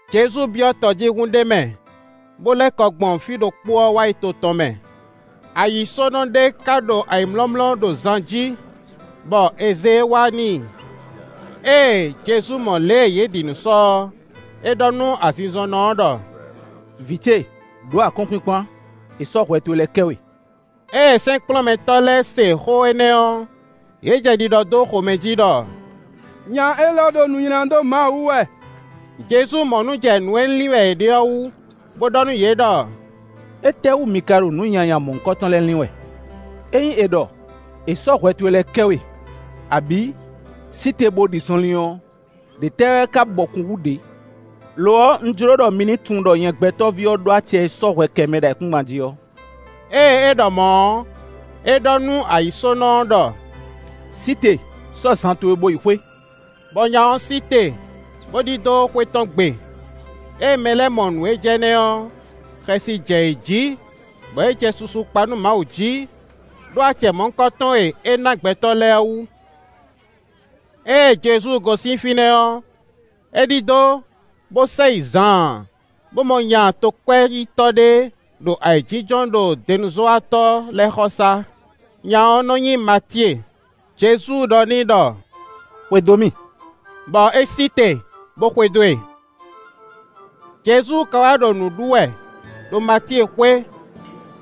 Jezu byɔ́ tɔjíhún ɖé mɛ, bó lɛ́ kɔ gbɔn fí ɖokpó ɔ́ wá to tɔn mɛ. Ayǐsónɔ ɖé ka ɖo ayǐmlɔ́mlɔ́ ɖo zan jí, bɔ è zě e wá n'i. Ée Jezu mɔ lě e yě ɖi nǔ sɔ ɔ́, é ɖɔ nú azinzɔnnɔ ɔ́ ɖɔ: “Vǐ ce, ɖǒ akɔ́nkpinkpan; è sɔ́ hwɛ towe lɛ́ɛ kɛ we.” Ée sɛ́nkplɔ́nmɛtɔ́ lɛ́ɛ se xó énɛ́ ɔ́, yě jɛ ɖiɖɔ dó xomɛ jí ɖɔ: “Nya élɔ́ ɖo nu nylá dó Mawu wú wɛ.” Jezu mɔ nǔ jɛ nǔ e lin wɛ yě ɖe ɔ́ wú, bó ɖɔ nú yě ɖɔ: “Étɛ́wú mi ka ɖo nǔ nyanya mɔ̌hunkɔtɔn lɛ́ɛ lin wɛ? Ényí è ɖɔ: ‘È sɔ́ hwɛ towe lɛ́ɛ kɛ we,’ abǐ: ‘Sí te bó ɖi zɔnlin’ ɔ́, ɖě tɛ́ wɛ ka bɔkun hú ɖě? Lo ɔ́, un jló ɖɔ mi ní tunwun ɖɔ nyɛ Gbɛtɔ́ví ɔ́ ɖó acɛ e sɔ́ hwɛ kɛ mɛ ɖo ayǐkúngban jí ɔ́.” Ée é ɖɔ mɔ̌ ɔ́, é ɖɔ nú ayǐsónɔ ɔ́ ɖɔ: “Sí te, sɔ́ zan towe, bó yi xwé.” Bɔ nya ɔ́ sí te, bó ɖidó xwé tɔn gbe. Ée mɛ lɛ́ɛ mɔ nǔ e jɛ énɛ́ ɔ́, xɛsi jɛ yě jí, bɔ yě jɛ susu kpa nú Mawu jí, ɖó acɛ mɔ̌hunkɔtɔn e é ná gbɛtɔ́ lɛ́ɛ ɔ́ wú. Ée Jezu gosín fínɛ́ ɔ́, é ɖidó, bó sɛ yi zaan, bó mɔ nya tokwɛ́yítɔ́ ɖé ɖo ayǐjínjɔ́n ɖo denuzɔ́watɔ́ lɛ́ɛ xɔsá. Nya ɔ́ nɔ nyí Matíe. Jezu ɖɔ n'i ɖɔ: “Xwedó mì;” bɔ é sí te, bó xwedó e. Jezu ka wá ɖo nǔ ɖu wɛ, ɖo Matíe xwé,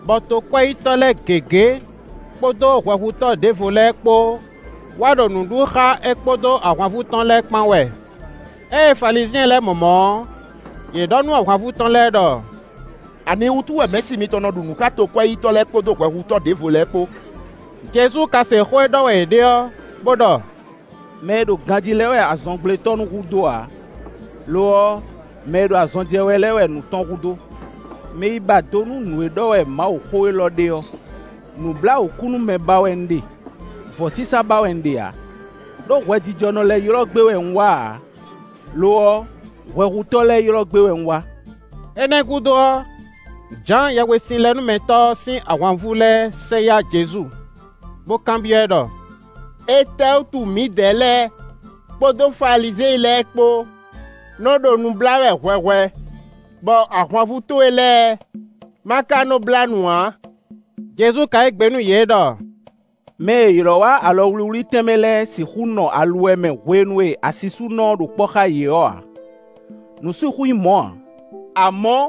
bɔ tokwɛ́yítɔ́ lɛ́ɛ gěgé, kpódó hwɛhutɔ́ ɖěvo lɛ́ɛ kpó wá ɖo nǔ ɖu xá é kpódó ahwanvú tɔn lɛ́ɛ kpán wɛ. Ée Falizyɛn lɛ́ɛ mɔ mɔ̌ ɔ́, yě ɖɔ nú ahwanvú tɔn lɛ́ɛ ɖɔ: “Aniwútu wɛ Mɛ̌si mitɔn nɔ ɖu nǔ xá tokwɛ́yítɔ́ lɛ́ɛ kpódó hwɛhutɔ́ ɖěvo lɛ́ɛ kpó?” Jezu ka se xó e ɖɔ wɛ yě ɖe ɔ́, bó ɖɔ: “Mɛ e ɖo ganjí lɛ́ɛ wɛ azɔngblétɔ́ nú hu dó ǎ; lo ɔ́, mɛ e ɖo azɔn jɛ wɛ lɛ́ɛ wɛ nǔ tɔn hu dó. Mi yi ba do nú nǔ e ɖɔ wɛ Mawuxó élɔ́ ɖe ɔ́: ‘Nǔbláwǔkúnúmɛ ba wɛ un ɖe; vɔ̌sísá ba wɛ un ɖe ǎ.’ Ɖó hwɛjijɔnɔ lɛ́ɛ ylɔ́ gbé wɛ un wá ǎ; lo ɔ́, hwɛhutɔ́ lɛ́ɛ ylɔ́ gbé wɛ un wá.” Énɛ́ gúdo ɔ́, Jǎan Yɛhwesinlɛnúmɛtɔ́ ɔ́ sín ahwanvú lɛ́ɛ sɛ yá Jezu, bó kanbyɔ́ ɛ ɖɔ: “Étɛ́wútu mǐdɛɛ lɛ́ɛ kpódó Falizyɛn lɛ́ɛ kpó nɔ ɖo nu blá wɛ hwɛhwɛ, bɔ ahwanvú towe lɛ́ɛ ma ka nɔ́ blá nu ǎ?” Jezu ka yí gbe nú yě ɖɔ: “Mɛ e è ylɔ́ wá alɔ wlíwlí tɛnmɛ lɛ́ɛ sixú nɔ aluwɛ mɛ hwenu e asisúnɔ ɔ́ ɖo kpɔ́ xá yě ɔ́ ǎ; nǔ sixú nyí mɔ̌ ǎ; amɔ̌,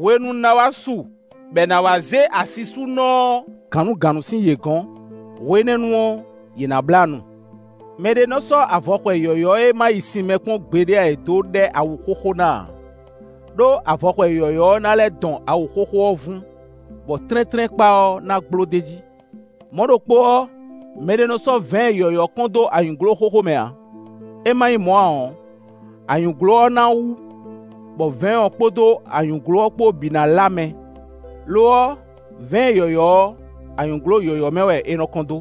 hwenu ná wá su bɔ è nǎ wá zé asisúnɔ ɔ́ gǎnnugǎnnu sín yě gɔ̌n; hwe énɛ́ nu ɔ́, yě ná blá nu. “Mɛ ɖé nɔ́ sɔ́ avɔxwɛ yɔ̌yɔ́ e ma yi sin mɛ kpɔ́n ǎ é dó ɖɛ́ awu xóxó ná ǎ; ɖó avɔxwɛ yɔ̌yɔ́ ɔ́ ná lɛ́ dɔn awu xóxó ɔ́ vún, bɔ tlɛ́ntlɛ́nkpa ɔ́ ná gbló d'é jí. Mɔ̌ ɖokpó ɔ́, mɛɖé nɔ́ sɔ́ vɛ̌ɛn yɔ̌yɔ́ kɔn dó anyǔglo xóxó mɛ ǎ; é ma nyí mɔ̌ ǎ ɔ́, anyǔglo ɔ́ ná wú, bɔ vɛ̌ɛn ɔ́ kpódó anyǔglo ɔ́ kpó bǐ ná lá mɛ. Lo ɔ́, vɛ̌ɛn yɔ̌yɔ́ ɔ́, anyǔglo yɔ̌yɔ́ mɛ wɛ è nɔ kɔn dó,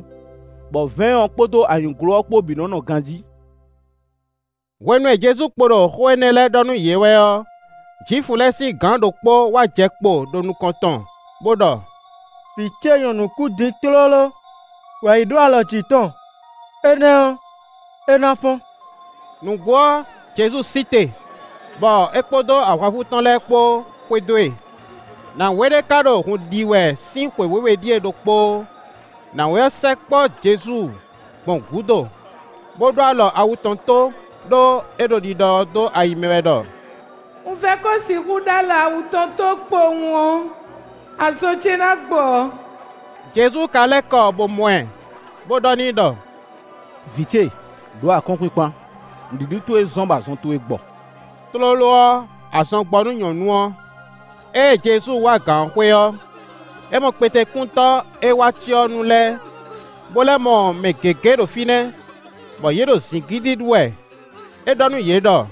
bɔ vɛ̌ɛn ɔ́ kpódó anyǔglo ɔ́ kpó bǐ nɔ́ nɔ ganjí.” Hwenu e Jezu kpo ɖo xó énɛ́ lɛ́ɛ ɖɔ nú yě wɛ ɔ́, Jwifu lɛ́ɛ sín gǎn ɖokpó wá jɛ kpo ɖo nukɔn tɔn, bó ɖɔ: “Vǐ ce nyɔ̌nu kú din tlóló; wǎ yi ɖó alɔ jǐ tɔn, énɛ́ ɔ́, é ná fɔ́n.” Nǔgbó ɔ́, Jezu sí te, bɔ é kpódó ahwanvú tɔn lɛ́ɛ kpó xwedó e. Nǎwe ɖé ká ɖo hun ɖi wɛ sín xwe wěwe ɖíe ɖokpóó; nǎwe ɔ́ sɛkpɔ́ Jezu gbɔn gúdo, bó ɖó alɔ awu tɔn tó, ɖó é ɖo ɖiɖɔ dó ayi mɛ wɛ ɖɔ: “Un vɛ́ ko sixú ɖó alɔ awu tɔn tó kpowun ɔ́, azɔn ce ná gbɔ.” Jezu ka lɛ́ kɔ bó mɔ ɛ, bó ɖɔ n'i ɖɔ: “Vǐ ce, ɖǒ akɔ́nkpinkpan, nǔɖiɖi towe zɔ́n bɔ azɔn towe gbɔ.” Tlóló ɔ́, azɔn gbɔ nú nyɔ̌nu ɔ́. Ée Jezu wá gǎn ɔ́ xwé ɔ́, é mɔ kpetekúntɔ́ e wá cyɔ ɔ́ nu lɛ́ɛ, bó lɛ́ mɔ mɛ gěgé ɖo fínɛ́, bɔ yě ɖo zǐngídi ɖú wɛ. É ɖɔ nú yě ɖɔ: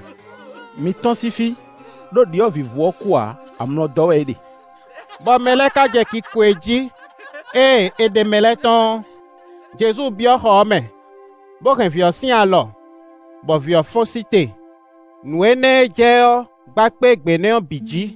“Mi tɔ́n sín fí, ɖó ɖyɔ̌vǐvú ɔ́ kú ǎ, amlɔ dɔ́ wɛ é ɖe.” Bɔ mɛ lɛ́ɛ ka jɛ kiko e jí. Ée è ɖe mɛ lɛ́ɛ tɔ́n ɔ́, Jezu byɔ́ xɔ ɔ́ mɛ, bó hɛn vǐ ɔ́ sín alɔ, bɔ vǐ ɔ́ fɔ́n sí te. Nǔ énɛ́ e jɛ ɔ́ gba kpé gbě nɛ́ ɔ́ bǐ jí.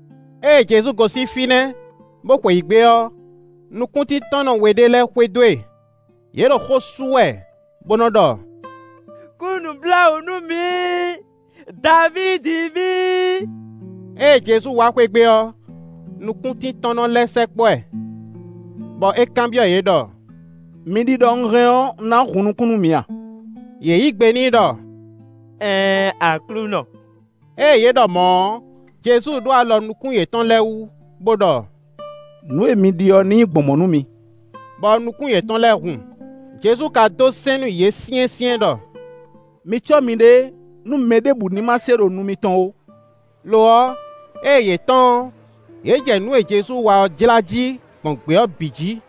Ée Jezu gosín fínɛ́, bó xweyǐgbe ɔ́, nukúntíntɔ́nnɔ we ɖé lɛ́ɛ xwedó e; yě ɖo xó sú wɛ bó nɔ́ ɖɔ: “Kú nǔbláwǔ nú mǐ, Davídi ví.” Ée Jezu wá xwé gbe ɔ́, nukúntíntɔ́nnɔ lɛ́ɛ sɛkpɔ́ ɛ, bɔ é kanbyɔ́ yě ɖɔ: “Mi ɖi ɖɔ un hɛn ɔ́, un ná hun nukún nú mi a?” Yě yí gbe n'i ɖɔ: “Ɛɛn Aklúnɔ.” Ée yě ɖɔ mɔ̌ ɔ́, Jezu ɖó alɔ nukún yětɔn lɛ́ɛ wú, bo ɖɔ: “Nǔ e mi ɖi ɔ́ ní nyí gbɔn mɔ̌ nú mi.” Bɔ nukún yětɔn lɛ́ɛ hun. Jezu ka dó sɛ́n nú yě syɛ́nsyɛ́n ɖɔ: “Mi cɔ́ miɖée, nú mɛ ɖěbǔ ní ma se ɖo nu mitɔn ó.” Lo ɔ́, ée yě tɔ́n ɔ́, yě jɛ nǔ e Jezu wa ɔ́ jlá jí gbɔn gbě ɔ́ bǐ jí.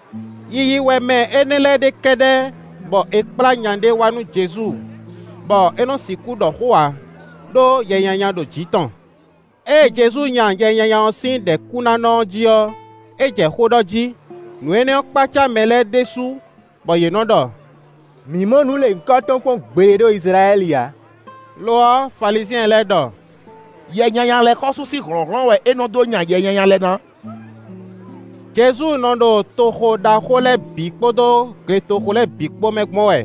Yiyi wɛ mɛ énɛ́ lɛ́ɛ ɖe kɛ́ɖɛ́ bɔ è kplá nya ɖé wá nú Jezu, bɔ é nɔ́ sixú ɖɔ xó ǎ, ɖó yɛ nyanya ɖo jǐ tɔn. Ée Jezu nya yɛ nyanya ɔ́ sín ɖɛ̌kúnánɔ ɔ́ jí ɔ́, é jɛ xó ɖɔ jí. Nǔ énɛ́ ɔ́ kpácá mɛ lɛ́ɛ ɖésú, bɔ yě nɔ́ ɖɔ: “Mǐ mɔ nǔ lěhunkɔtɔn kpɔ́n gbeɖé ɖo Izlayɛ́li ǎ.” Lo ɔ́, Falizyɛn lɛ́ɛ ɖɔ: “Yɛ nyanya lɛ́ɛ xɔ́sú sín hlɔ̌nhlɔ́n wɛ é nɔ dó nya yɛ nyanya lɛ́ɛ ná.” Jezu nɔ ɖo toxo ɖaxó lɛ́ɛ bǐ kpódó gletoxo lɛ́ɛ bǐ kpó mɛ gbɔn wɛ,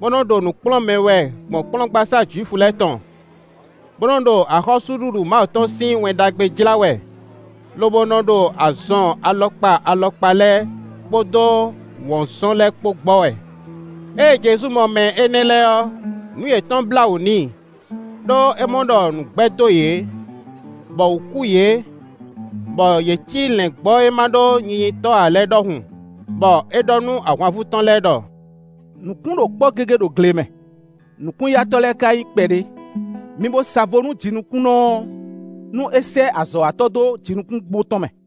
bó nɔ́ ɖo nǔ kplɔ́n mɛ wɛ gbɔn kplɔ́ngbasá Jwifu lɛ́ɛ tɔn, bó nɔ́ ɖo axɔ́súɖuɖu Mawu tɔn sín Wɛn Ɖagbe jlá wɛ; lobo nɔ ɖo azɔn alɔkpa alɔkpa lɛ́ɛ, kpódó wɔ̌nzɔn lɛ́ɛ kpó gbɔ wɛ. Ée Jezu mɔ mɛ énɛ́ lɛ́ɛ ɔ́, nǔ yětɔn blá wǔ n'i, ɖó é mɔ ɖɔ nǔ gbɛ́ dó yě, bɔ wǔ kú yě, bɔ yě cí lɛ̌ngbɔ́ e ma ɖó nyinyitɔ́ ǎ lɛ́ɛ é ɖɔhun, bɔ é ɖɔ nú ahwanvú tɔn lɛ́ɛ ɖɔ: “Nǔkún ɖo kpɔ́ gégé ɖo gle mɛ; nǔkún-yatɔ́ lɛ́ɛ ka nyí kpɛɖé. Mi bo sa vo nú jinukúnnɔ ɔ́, nú é sɛ́ azɔ̌watɔ́ dó jinukúngbo tɔn mɛ.”